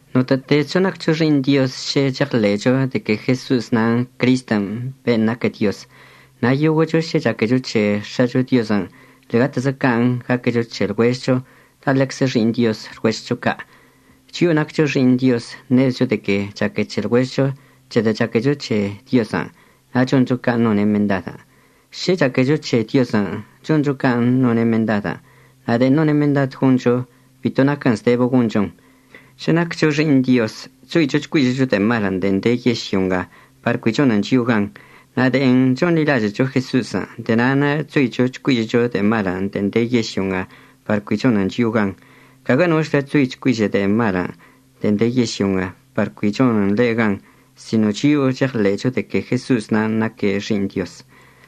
Notə'ətezcho naccho xi'iṉ Dioz šə cheɉḻe'echo de que Jeso'os nan' Cristən' ben' naquə Dioz. Na' yoguə'əcho šə chaquecho c̱he X̱acho Diozən' ḻe'egatezəczə can' gaquecho c̱he lɉuežɉcho, la' ḻeczə xi'iṉ Dioz lɉuežɉcho ca'. Chio'o naccho xi'iṉ Diozən' ṉezecho de que chaque c̱he lɉuežɉcho c̱hedə' chaquecho c̱he Diozən' na' choncho can' none' mendad. Šə chaquecho c̱he Diozən', choncho can' none' mendadən'. Na' de'en none' mendad goncho bito naquən zdebə gonchon. Šə naccho xi'iṉ Dioz chzoicho chcuižə'əcho de'e malən' de'en de yežlyo nga par cui chonən chio'o gan. Na' de'en chonḻilažə'əcho Jeso'osən' de'e na'anə' chzoicho chcuižə'əcho de'e malən' de'en de yežlyo nga par cui chonən chio'o gan. Caguə nochlə chzoi chcuižə' de'e malən' de'en de yežlyo nga par cui chonən ḻe' gan sino chio'o cheɉḻe'echo de que Jeso'os nan' naque' Xi'iṉ Diozən'.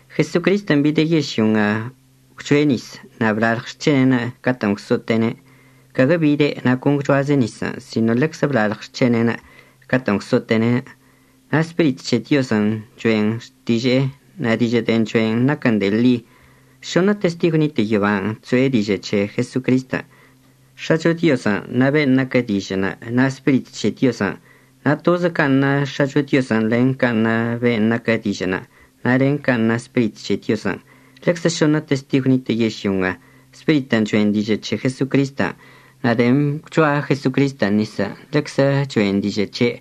Jesocristən' bide' yežlyo nga gwchoe' nis na' blalɉ xc̱hene'enə' catə'ən gwso'ote'ene'. Caguə bide' na' con gwchoaze' nisən', sino ḻeczə blalɉ xc̱hene'enə' catə'ən gwso'ote'ene'. Na' Spirit c̱he Diozən' cho'en xtiže'enə' na' dižə' de'en cho'en naquən de'e ḻi. Šoṉə testigw nitə' yoban' chso'e dižə' c̱he Jesocristən', X̱acho Diozən' na' ben' naquə Dižə'ənə', na' Spirit c̱he Diozən'. Na' tozə can' na X̱acho Diozən' len can' na ben' naquə Dižə'ənə', na' len can' na Spirit c̱he Diozən'. Ḻeczə šoṉə testigw nitə' yežlyo nga, Spiritən' cho'en dižə' c̱he Jesocristən'. Na' de'en gwchoa Jesocristən' nisən' ḻeczə cho'en dižə' c̱he'.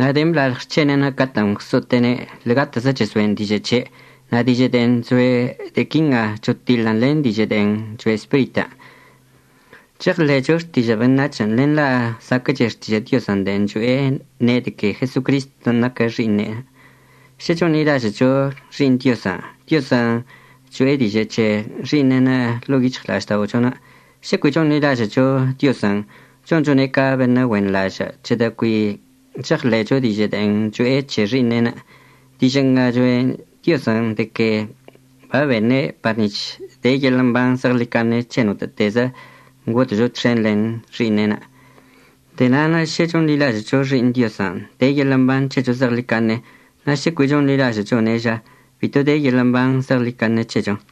Na' de'en blalɉ xc̱hene'en catə'ən gwso'ote'ene' ḻe'egatezə chezo'en dižə' c̱he'. Na' dižə' de'en chsoe' de'e quinga chotiḻən len dižə' de'en choe' Spiritən'. Cheɉḻe'echo xtižə' beṉac̱hən', len la' zaquə'əche xtižə' Diozən' de'en cho'e ne' de que Jesocristən' naque' Xi'iṉe'enə'. Šə chonḻilažə'əcho Xi'iṉ Diozən', Diozən' cho'e dižə' c̱he Xi'iṉe'enə' ḻo'o yic̱hɉla'ažda'ochonə'. Šə cui chonḻilažə'əcho Diozən' chonchone' ca beṉə' güenḻažə' c̱hedə' cui cheɉḻe'echo dižə' de'en cho'e c̱he Xi'iṉe'enə'. Dižə' nga choe' Diozən', de que babene' par nic̱h de yeḻə' mban zeɉḻicaṉe c̱he notə'ətezcho ngodə'əcho txen len Xi'iṉe'enə'. De'e na'anə' šə chonḻilažə'əcho Xi'iṉ Diozən' de yeḻə' mban c̱hecho zeɉḻicaṉe. Na' sə cui chonḻilažə'əchone' ža, bito de yeḻə' mban zeɉḻicaṉe c̱hecho.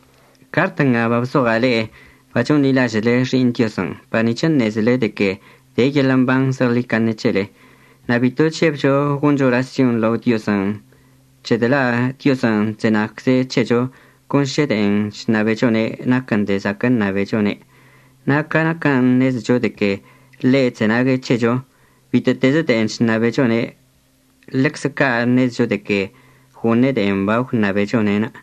Cart nga babzoɉa' le'e bachonḻilažə'əle Xi'iṉ Diozən' par nic̱h əṉezele de que de yeḻə' mban zeɉḻicaṉe c̱hele. Na' bito chžebcho goncho orasyon lao Diozən', c̱hedə' la' Diozən' chzenagcze' c̱hecho con šə de'en chṉabechone' naquən de'e zaquə' ṉabechone'. Na' ca naquən' ṉezecho de que ḻe' chzenague' c̱hecho bitə'ətezə de'en chṉabechone', ḻeczə ca' ṉezecho de que goṉe' de'en bagwṉabechone'enə'.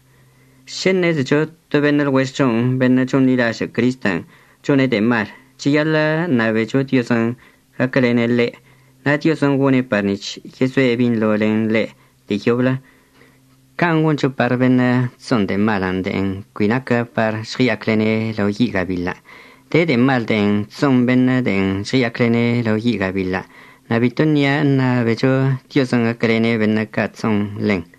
Šə ṉezecho to beṉə' lɉuežɉcho beṉə' chonḻilažə' Cristən' chone' de'e mal, cheyaḻə' ṉabecho Diozən' gaquəlene' ḻe', na' Diozən' gone' par nic̱h yezoe' binḻo len ḻe' de'e yoblə. Can' goncho par beṉə' chso'on de'e malən' de'en cui naquən par žɉəya'aclene'en lao yi' gabiḻən'. De de'e mal de'en chso'on beṉə' de'en žɉəya'aclene' lao yi' gabiḻən', na' bito nia' əṉabecho Diozən' gaquəlene' beṉə' chso'on ḻen.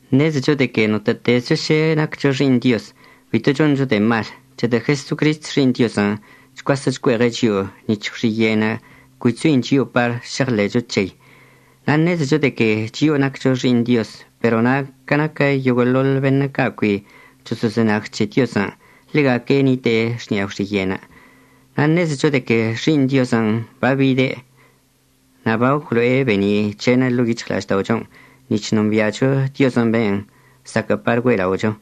Ṉezecho de que notə'ətezcho šə naccho xi'iṉ Dioz bito choncho de'e mal, c̱hedə' Jesocrist Xi'iṉ Diozən' chcuasə' chcue'eɉe' chio'o nic̱h gwxiye'enə' cui chzoin chio'o par šeɉḻe'echo c̱hei. Na' ṉezecho de que chio'o naccho xi'iṉ Dioz, pero na' ca naquə yoguə'əḻoḻ beṉə' ca' cui choso'ozenag c̱he Diozən', ḻega'aque' nite'e xni'a gwxiye'enə'. Na' ṉezecho de que Xi'iṉ Diozən' babide' na' bagwlo'o be'eni' c̱he'enə' ḻo'o yic̱hɉla'ažda'ochon' nic̱h nombi'acho Diozən' ben' zaquə' par güe'ela'ocho.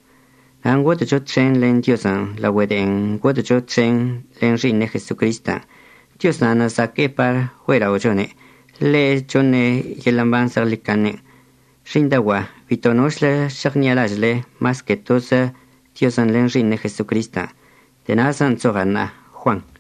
Na' ngodə'əcho txen len Diozən' laogüe de'en ngodə'əcho txen len Xi'iṉe' Jesocristən'. Dioz na'anə' zaquə'əcze' par güe'ela'ochone'. Ḻe' choṉe' yeḻə' mban zeɉḻicaṉən'. Xi'iṉdaogua'a bito nochlə šeɉṉi'alažə'əle mas que tozə Diozən' len Xi'iṉe' Jesocristən'. De'e na'azən' chzoɉa' ṉa'a. Juan